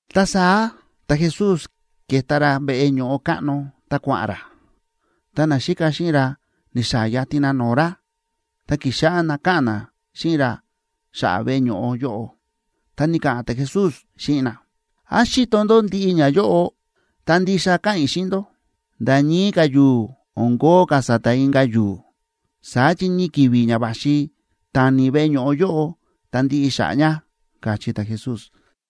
Ta saá ta̱Jesús ke̱ta ra veꞌe ño̱ꞌo káꞌno ta kua̱ꞌa̱n ra, ta naxíka xíꞌin ra ni̱xaa̱ yatin na no̱o̱ ra, ta ki̱xáꞌá na káꞌa̱n na xíꞌin ra xa̱ꞌa̱ veꞌe ño̱ꞌo yóꞌo. Ta ni̱ka̱ꞌa̱n ta̱Jesús xíꞌin na: ―¿Án xíto ndó ndiꞌi ñayóꞌo? Ta ndixa káꞌa̱n i̱ xíꞌin ndó, nda̱ ñii ka̱ yu̱u̱ o̱n kóo ka̱ sa̱ta̱ inka̱ yu̱u̱. Saá chi ñii ki̱vi̱ ña va̱xi tani veꞌe ño̱ꞌo yóꞌo ta ndiꞌi xa̱ꞌa̱ ña ―káchí ta̱Jesús.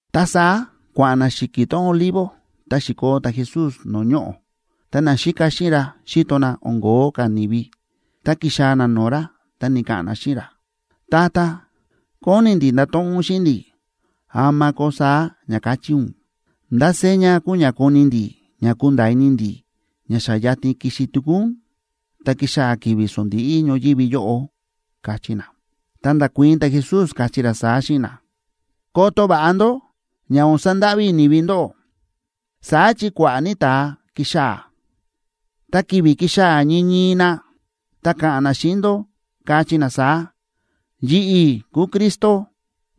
Ta saá kua̱ꞌa̱n na xi̱ki̱ tón Olivo ta xi̱koo ta̱Jesús no̱o̱ ñoꞌo̱, ta naxíka xíꞌin ra xi̱to na o̱n ko̱ó ka̱ ni̱vi, ta ki̱xaa̱ na no̱o̱ ra, ta ni̱ka̱ꞌa̱n na xíꞌin ra: ―Tata, kóni ndi̱ ndato̱ꞌon ún xíꞌin ndi̱, ¿ama koo saá ña ka̱chí ún? ¿Ndá seña kuu ña koni ndi̱ ña kunda̱a̱ ini ndi̱ ña xa yatin kixi tuku ún, ta kixaa̱ ki̱vi̱ sondíꞌí ñoyívi yóꞌo? ―káchí na. Ta nda̱kuii̱n ta̱Jesús, káchí ra saá xíꞌin na: ―Koto va̱ꞌa ndó ña o̱n sandáꞌví ni̱vi ndóꞌó. Saá chi kua̱ꞌa̱ ní ta̱a kixaa̱, ta ki̱vi̱ kixaa̱ ñii ñii na, ta ka̱ꞌa̱n na xíꞌin ndó, kachí na saá: “Yi̱ꞌi̱ kúu Cristo,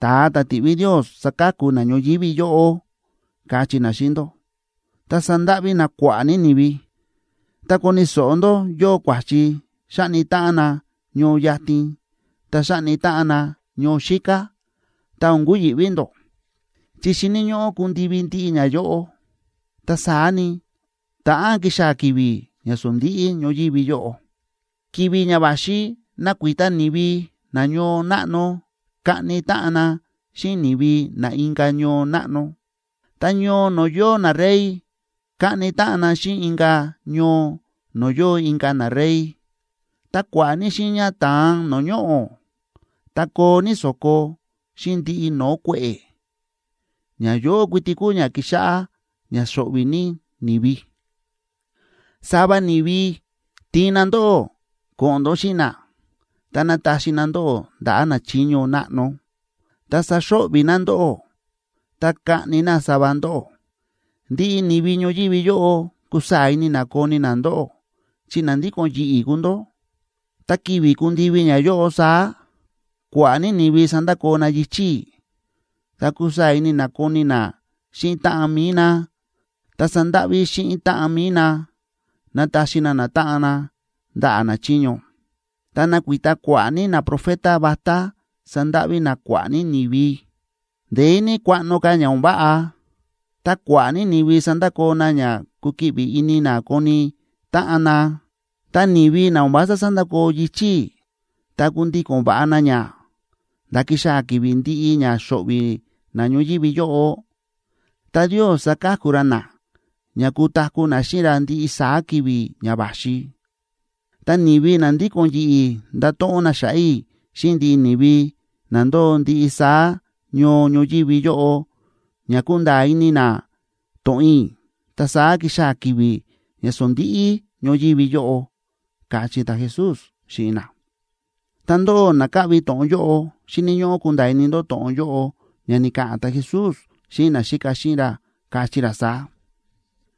ta̱a ta̱ ti̱ꞌví Ndios saka̱ku na ñoyívi yóꞌo”, kachí na xíꞌin ndó, ta sandáꞌví na kua̱ꞌa̱ ní ni̱vi. Ta koni̱ so̱ꞌo ndó yóo kua̱chi xáꞌni táꞌan na ñoo yatin, ta xáꞌni táꞌan na ñoo xíká, ta o̱n kuyi̱ꞌví ndó. Chi xíni̱ ñóꞌó kundivi ndiꞌi ñayóꞌo, ta saá ni, ta̱ꞌán kixaa̱ ki̱vi̱ ña sondíꞌí ñoyívi yóꞌo. Ki̱vi̱ ña va̱xi nakuita ni̱vi na ñoo náꞌno kaꞌni táꞌan na xíꞌin ni̱vi na inka̱ ñoo náꞌno, ta ñoo no̱o̱ yóo narey kaꞌni táꞌan na xíꞌin inka̱ ñoo no̱o̱ yóo inka̱ narey. Ta kua̱ꞌa̱ ní xiiña ta̱an no̱o̱ ñoꞌo̱, ta koo ní so̱ko, xíꞌin ndiꞌi no̱o̱ kue̱ꞌe̱. Ñayóꞌo kuiti kuu ña kixáꞌá ña xo̱ꞌvi̱ ní ni̱vi. ’Sava ni̱vi tiin na ndóꞌó ko̱ꞌo̱n ndó xíꞌin na, ta nataxi na ndóꞌó ndaꞌa̱ nachiño náꞌno, ta saxo̱ꞌvi̱ na ndóꞌó, ta kaꞌni na sava ndóꞌó. Ndiꞌi ni̱vi ñoyívi yóꞌo kusaa̱ ini na koni na ndóꞌó chi na ndíko̱n yi̱ꞌi̱ kúu ndó. Ta ki̱vi̱ kundivi ñayóꞌo saá, kua̱ꞌa̱ ní ni̱vi sandakoo na yichi̱ i̱, ta kusaa̱ ní ini na koni na xíꞌin táꞌan mi̱i na, ta sandáꞌví xíꞌin táꞌan mi̱i na nataxi na natáꞌan na ndaꞌa̱ nachiño. Ta nakuita kua̱ꞌa̱ ní naprofeta vatá sandáꞌví na kua̱ꞌa̱ ní ni̱vi. Ndeé ní kuaꞌno ka̱ ña o̱n váꞌa, ta kua̱ꞌa̱ ní ni̱vi sandakoo na ña kukiꞌvi ini na koni táꞌan na. Ta ni̱vi na o̱n vása sandakoo yichi̱ i̱, ta kundíko̱n va̱ꞌa na ña, nda̱ kixaa̱ ki̱vi̱ ndi̱ꞌi ña xo̱ꞌvi̱ na ñoyívi yóꞌo, ta Ndios saka̱ku ra na ña kutaku̱ na xíꞌin ra ndiꞌi saá ki̱vi̱ ña va̱xi. Ta ni̱vi na ndíko̱n yi̱ꞌi̱ ndato̱ꞌon na xa̱ꞌa̱ i̱ xíꞌin ndiꞌi ni̱vi na ndóo ndiꞌi saá ñoo ñoyívi yóꞌo ña kunda̱a̱ ini na to̱ꞌon i̱, ta saá kixaa̱ ki̱vi̱ ña sondíꞌí ñoyívi yóꞌo ―káchí ta̱Jesús xíꞌin na. Ta ndóꞌó na káꞌvi to̱ꞌon yóꞌo xíni̱ ñóꞌó kunda̱a̱ ini ndó to̱ꞌon yóꞌo ña ni̱ka̱ꞌa̱n ta̱Jesús xíꞌin naxíka xíꞌin ra, káchí ra saá: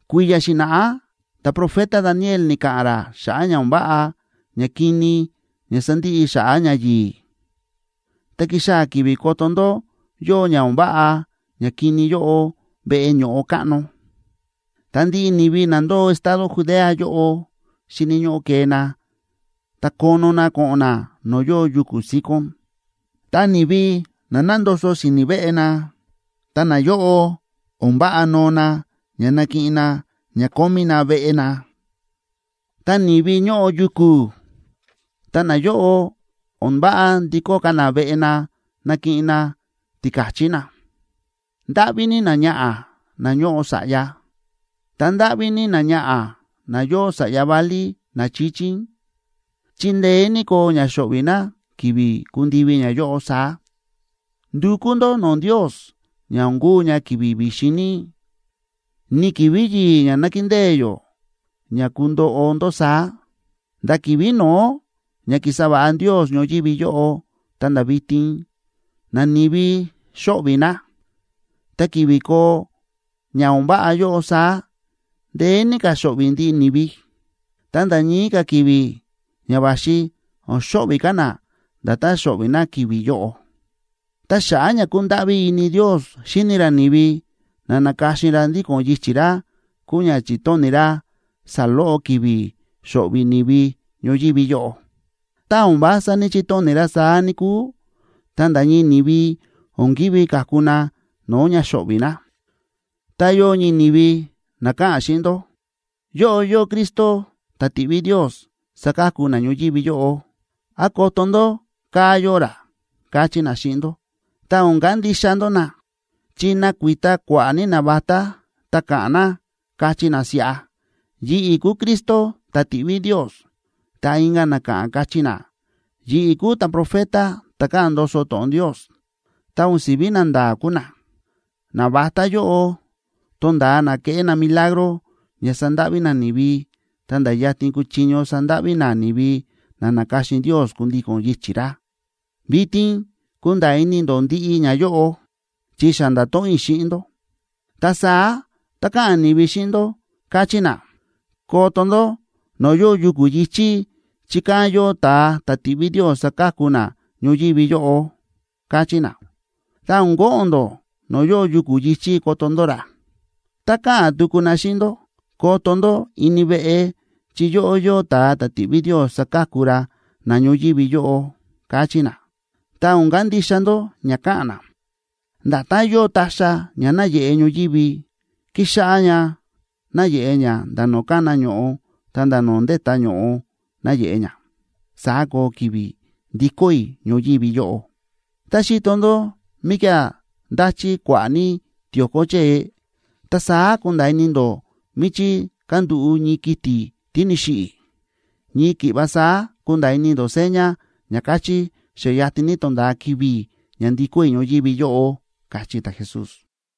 ―Kui̱ya̱ xi̱na̱ꞌá ta̱profeta Daniel ni̱ka̱ꞌa̱n ra xa̱ꞌa̱ ña o̱n váꞌa ñakini ña sandiꞌi xa̱ꞌa̱ ñayi̱i̱. Ta kixaa̱ ki̱vi̱ koto ndó yóo ña o̱n váꞌa ñakini yóꞌo veꞌe ño̱ꞌo káꞌno, ta ndiꞌi ni̱vi na ndóo estado Judea yóꞌo, xíni̱ ñóꞌó kee na ta kono na ko̱ꞌo̱n na no̱o̱ yóo yuku̱ síkón. Tá ni̱vi nándoso na si̱ni̱ veꞌe na, ta nayóꞌo o̱n váꞌa noo na nakiꞌin na ña kómí na veꞌe na. Tá ni̱vi ñóꞌo yuku̱, ta nayóꞌo, o̱n váꞌa ndikó ka̱ na veꞌe na nakiꞌin na tika̱chí na. ¡Ndáꞌví ní náñaꞌa̱ ná ñóꞌo sa̱ꞌya, ta ndáꞌví ní náñaꞌa̱ ná yóo sa̱ꞌya válí na chíchín, chi ndeé ní koo ña xo̱ꞌvi̱ ná ki̱vi̱ kundivi ñayóꞌo saá! Ndukú ndó no̱o̱ Ndios ña o̱n kuu ña ki̱vi̱ vi̱xin ní, ni ki̱vi̱ yi̱i̱ ña nákindée yó ña kundoꞌo ndó saá. Nda̱ ki̱vi̱ no̱ó ña ki̱sa va̱ꞌa Ndios ñoyívi yóꞌo ta̱nda̱ vitin, nani̱vi xóꞌvi̱ na. Ta ki̱vi̱ koo ña o̱n váꞌa yóꞌo saá, ndeé ní ka̱ xo̱ꞌvi̱ ndiꞌi ni̱vi. Ta nda̱ ñii ka̱ ki̱vi̱ ña va̱xi o̱n xo̱ꞌvi̱ ka̱ na nda̱tán xo̱ꞌvi̱ na ki̱vi̱ yóꞌo. Ta xa̱ꞌa̱ ña kúndáꞌví ini Ndios xíni ra ni̱vi na na̱ka̱xin ra ndíko̱n yichi̱ ra kúu ña chi̱tóni̱ ra saloꞌo ki̱vi̱ xo̱ꞌvi̱ ni̱vi ñoyívi yóꞌo. Tá o̱n vása ní‑chitóni̱ ra saá, níkúu, ta nda̱ ñii ni̱vi o̱n ki̱ví ka̱ku na no̱o̱ ña xóꞌvi̱ na. ’Tá yóo ñii ni̱vi na ka̱ꞌa̱n xíꞌin ndó: “Yóꞌo yóo Cristo ta̱ ti̱ꞌví Ndios saka̱ku na ñoyívi yóꞌo”, án “Koto ndó, kaa̱ yóo ra”, kachí na xíꞌin ndó, ta o̱n kandixa ndó na. Chi nakuita kua̱ꞌa̱ ní navatá ta ka̱ꞌa̱n na, kachí na siꞌa: “Yi̱ꞌi̱ kúu Cristo ta̱ ti̱ꞌví Ndios”, ta inka̱ na ka̱ꞌa̱n, kachí na: “Yi̱ꞌi̱ kúu ta̱profeta ta̱ káꞌa̱n ndoso to̱ꞌon Ndios”, ta o̱n si̱ví nanda̱a̱ kúu na. Navatá yóꞌo tonda̱a na keꞌé na milagro ña sandáꞌví na ni̱vi, ta̱nda̱ yatin kuchiño sandáꞌví na ni̱vi na na̱ka̱xin Ndios kundíko̱n yichi̱ ra. Vitin kúnda̱a̱ ini ndó ndiꞌi ñayóꞌo, chi xa nda̱to̱ꞌon i̱ xíꞌin ndó. Ta saá tá ka̱ꞌa̱n ni̱vi xíꞌin ndó, kachí na: “Koto ndó no̱o̱ yóo yuku̱ yi̱chí, chi kán yóo ta̱a ta̱ ti̱ꞌví Ndios saka̱ku na ñoyívi yóꞌo”, kachí na, ta o̱n ko̱ꞌo̱n ndó no̱o̱ yóo yuku̱ yi̱chí koto ndó ra. Tá ka̱ꞌa̱n tuku na xíꞌin ndó: “Koto ndó ini veꞌe, chi yóꞌo yóo ta̱a ta̱ ti̱ꞌví Ndios saka̱ku na ñoyívi yóꞌo”, kachí na, ta o̱n kandixa ndó ña ka̱ꞌa̱n na. Nda̱tán yóo ta̱xa̱ ña náyeꞌe ñoyívi, kíxáꞌá ña náyeꞌe ña nda̱ no̱o̱ kána ño̱ꞌo ta̱nda̱ no̱o̱ ndétá ño̱ꞌo náyeꞌe ña, saá koo ki̱vi̱ ndikó i̱ ñoyívi yóꞌo. Tá xíto ndó míkía̱ ndáchí kua̱ꞌa̱ ní tio̱ko chée,a ta saá kúnda̱a̱ ini ndó míchí kándúꞌu̱ ñii kiti̱ tí ni̱xiꞌi̱. Ñii ki̱ꞌva saá kunda̱a̱ ini ndó seña ña kachí xa yatin ní tonda̱a ki̱vi̱ ña ndikó i̱ ñoyívi yóꞌo ―káchí ta̱Jesús.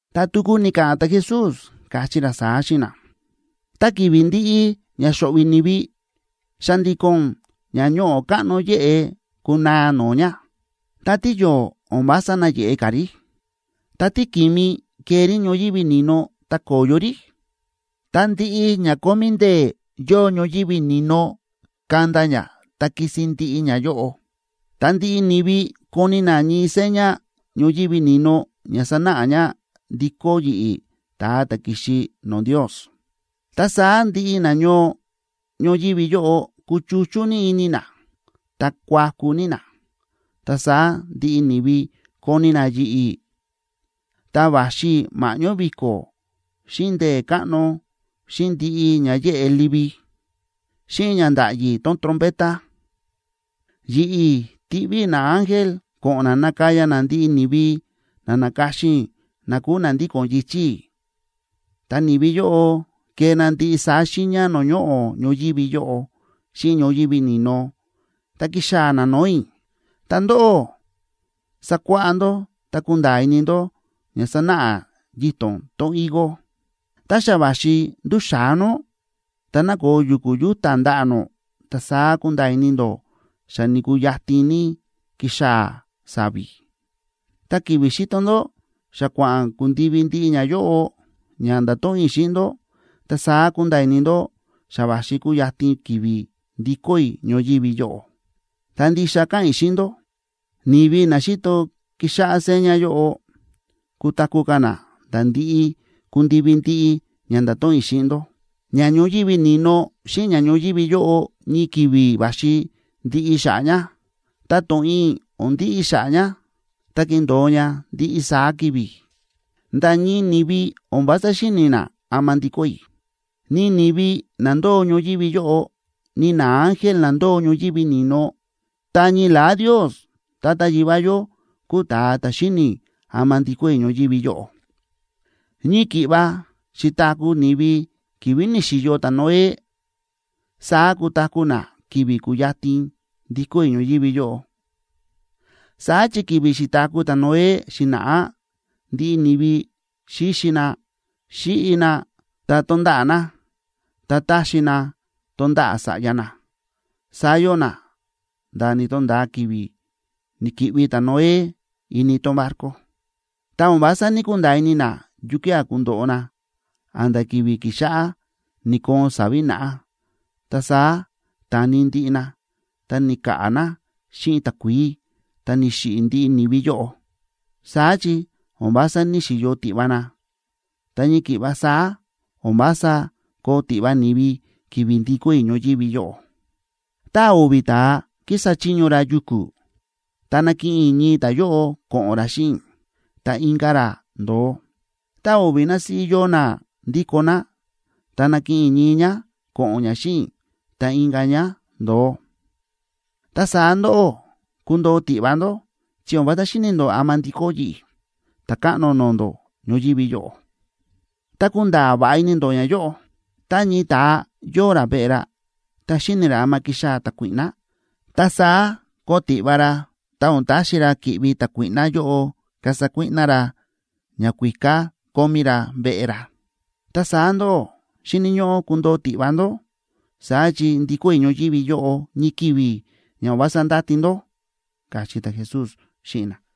Ta tuku ni̱ka̱ꞌa̱n ta̱Jesús, káchí ra saá xíꞌin na: ―Ta ki̱vi̱ ndiꞌi ña xo̱ꞌvi̱ ni̱vi, xa̱ndi̱ko̱n ña ño̱ꞌo káꞌno yéꞌe kunaa no̱o̱ ña, ta tíyo̱o̱ o̱n vása nayeꞌe ka̱ rí, ta tíki̱mi kee rí ñoyívi ni̱no ta ko̱yo rí, ta ndiꞌi ña kómí ndee̱ yóo ñoyívi ni̱no kanda ña ta kisin ndiꞌi ñayóꞌo. Ta ndiꞌi ni̱vi koni na ñii seña ñoyívi ni̱no ña sanáꞌa ña ndikó yi̱ꞌi̱, ta̱a ta̱ ki̱xi no̱o̱ Ndios, ta saá ndiꞌi nañoo ñoyívi yóꞌo kuchuchú ní ini na, ta kuaku ní na. Ta saá ndiꞌi ni̱vi koni na yi̱ꞌi̱, ta va̱xi i̱ ma̱ꞌñó vi̱ko̱, xíꞌin ndee̱ káꞌno, xíꞌin ndiꞌi ña yéꞌe livi. Xíꞌin ña ndáꞌyi trompeta, yi̱ꞌi̱ tiꞌví i̱ naángel ko̱ꞌo̱n na nakaya na ndiꞌi ni̱vi na na̱ka̱xin i̱ na kúu na ndíko̱n yichi̱ i̱. Ta ni̱vi yóꞌo kee na ndiꞌi saá xiiña no̱o̱ ñoꞌo̱ ñoyívi yóꞌo xíꞌin ñoyívi ni̱no, ta kixaa̱ na no̱o̱ i̱. ’Ta ndóꞌó, sakuáꞌá ndó ta kunda̱a̱ ini ndó ña sánáꞌa yito̱n tón higo: Tá xa va̱xi ndúxa̱á nó, ta nákoo yu̱ku̱ yúta̱ ndaꞌa̱ nó, ta saá kúnda̱a̱ ini ndó xa ni̱kuu yatin ní kixaa̱ sa̱vi̱. Ta ki̱vi̱ xíto ndó xa kua̱ꞌa̱n kundivi ndiꞌi ñayóꞌo ña nda̱to̱ꞌon i̱ xíꞌin ndó, ta saá kunda̱a̱ ini ndó xa va̱xi kuyatin ki̱vi̱ ndikó i̱ ñoyívi yóꞌo. Ta ndixa káꞌa̱n i̱ xíꞌin ndó, ni̱vi na xíto kixáꞌá seña yóꞌo kutaku̱ ka̱ na nda̱ ndi̱ꞌi ku̱ndivi ndiꞌi ña nda̱to̱ꞌon i̱ xíꞌin ndó. Ña ñoyívi ni̱no xíꞌin ña ñoyívi yóꞌo ñii ki̱vi̱ va̱xi ndiꞌi xa̱ꞌa̱ ña, ta to̱ꞌon i̱ o̱n ndiꞌi xa̱ꞌa̱ ña, ta kindo̱o ña ndiꞌi saá ki̱vi̱. ’Nda̱ ñii ni̱vi o̱n vása xíni̱ na ama ndikó i̱, ni ni̱vi na ndóo ñoyívi yóꞌo, ni naángel na ndóo ñoyívi ni̱no. Ta ñii la̱á Ndios Tata Yivá yó kúu ta̱a ta̱ xíni̱ ama ndikó i̱ ñoyívi yóꞌo. ’Ñii ki̱ꞌva xi̱taku̱ ni̱vi ki̱vi̱ ni̱xi̱yo ta̱Noé, saá kutaku̱ na ki̱vi̱ kuyatin ndikó i̱ ñoyívi yóꞌo. Saá chi ki̱vi̱ xi̱taku̱ ta̱Noé xi̱na̱ꞌá ndiꞌi ni̱vi xíxi na, xíꞌi na, ta tónda̱ꞌa̱ na, ta táxi na tonda̱ꞌa̱ sa̱ꞌya na, saá yóo na nda̱ ni̱to̱nda̱a ki̱vi̱ ni̱ki̱ꞌvi ta̱Noé ini tón barco. Ta o̱n vása ní‑kunda̱a̱ ini na yukía̱ kundoꞌo na a̱nda̱ ki̱vi̱ ki̱xáꞌá ni̱koon sa̱vi̱ naꞌá, ta saá ta̱ni ndiꞌi na ta ni̱ka̱ꞌa̱ na xíꞌin takuií ta ni̱xiꞌi̱ ndiꞌi ni̱vi yóꞌo. Saá chi o̱n vása ní‑xiyo tiꞌva na, ta ñii ki̱ꞌva saá o̱n vása koo tiꞌva ni̱vi ki̱vi̱ ndikó i̱ ñoyívi yóꞌo. Tá o̱vi̱ ta̱a kísa chiño ra yuku̱, ta nakiꞌin i̱ ñii ta̱yóꞌo ko̱ꞌo̱n ra xíꞌin i̱, ta inka̱ ra ndo̱o. Tá o̱vi̱ násíꞌí yóo ná ndíko ná, ta nakiꞌin i̱ ñii ñá ko̱ꞌo̱n ñá xíꞌin i̱, ta inka̱ ñá ndo̱o. ’Ta saá ndóꞌó, kundoo tiꞌva ndó chi o̱n vása xíni̱ ndó ama ndikó yi̱ꞌi̱, Ta̱káꞌno no̱o̱ ndó, ñoyívi yóꞌo. Ta kunda̱a̱ va̱ꞌa ini ndó ñayóꞌo: Tá ñii ta̱a yóo ra veꞌe ra, ta xíni̱ ra ama kixaa̱ ta̱kuíꞌná, ta saá koo tiꞌva ra ta o̱n taxi ra ki̱ꞌvi ta̱kuíꞌná yóꞌo kasa kuíꞌná ra ñakuíká kómí ra veꞌe ra. Ta saá ndóꞌó xíni̱ ñóꞌó kundoo tiꞌva ndó, saá chi ndikó i̱ ñoyívi yóꞌo ñii ki̱vi̱ ña o̱n vása ndáti ndó ―káchí ta̱Jesús xíꞌin na.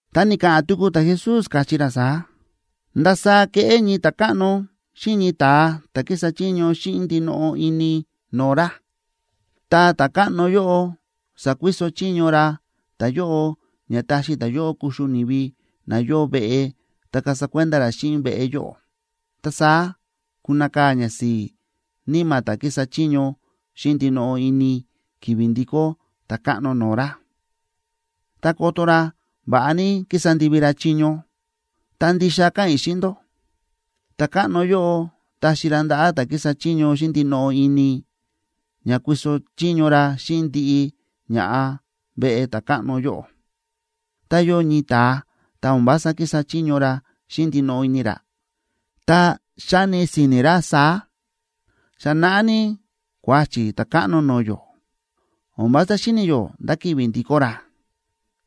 Ta ni̱ka̱ꞌa̱n tuku ta̱Jesús, káchí ra saá: ―¿Ndasaá keꞌé ñii ta̱káꞌno xíꞌin ñii ta̱a ta̱ kísa chiño xíꞌin ndinoꞌo ini no̱o̱ ra? Ta ta̱káꞌno yóꞌo sakuiso chiño ra ta̱yóꞌo ña taxi ta̱yóꞌo kuxu ni̱vi na yóo veꞌe ta kasa kuenda ra xíꞌin veꞌe yóꞌo. Ta saá kunakaa̱ ñasi̱i̱ níma̱ ta̱ kísa chiño xíꞌin ndinoꞌo ini ki̱vi̱ ndikó ta̱káꞌno no̱o̱ ra, ta koto ra va̱ꞌa ní ki̱sa ndivi ra chiño. Ta ndixa káꞌa̱n i̱ xíꞌin ndó, ta̱káꞌno yóꞌo taxi ra ndaꞌa̱ ta̱ kísa chiño xíꞌin ndinoꞌo ini, ña kuiso chiño ra xíꞌin ndiꞌi ña̱ꞌa veꞌe ta̱káꞌno yóꞌo. Tá yóo ñii ta̱a ta o̱n vása kísa chiño ra xíꞌin ndinoꞌo ini ra, ta xáni si̱ni̱ ra saá: “Xa naꞌá ní kuáchi̱ ta̱káꞌno no̱o̱ yó, o̱n vása xíni̱ yó ndá ki̱vi̱ ndikó ra”,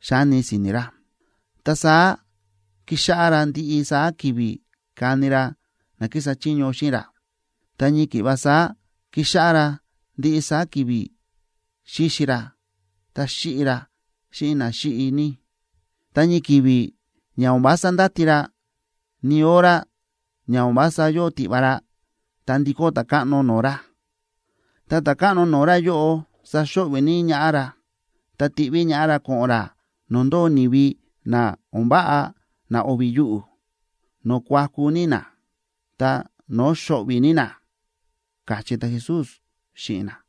xáni si̱ni̱ ra. Ta saá kíxáꞌá ra ndiꞌi saá ki̱vi̱ káni ra na kísa chiño xíꞌin ra, ta ñii ki̱ꞌva saá kíxáꞌá ra ndiꞌi saá ki̱vi̱ xíxi ra ta xíꞌi ra xíꞌin na xíꞌi ní. Ta ñii ki̱vi̱ ña o̱n vása ndáti ra, ni hora ña o̱n vása yóo tiꞌva ra, ta ndikó ta̱káꞌno no̱o̱ ra. Ta ta̱káꞌno no̱o̱ ra yóꞌo saxo̱ꞌvi̱ ní ñaꞌá ra, ta tiꞌví ñaꞌá ra ko̱ꞌo̱n ra no̱o̱ ndóo ni̱vi na o̱n váꞌa na o̱vi̱ yuꞌu̱, no̱o̱ kuaku ní na ta no̱o̱ xo̱ꞌvi̱ ní na ―káchí ta̱Jesús xíꞌin na.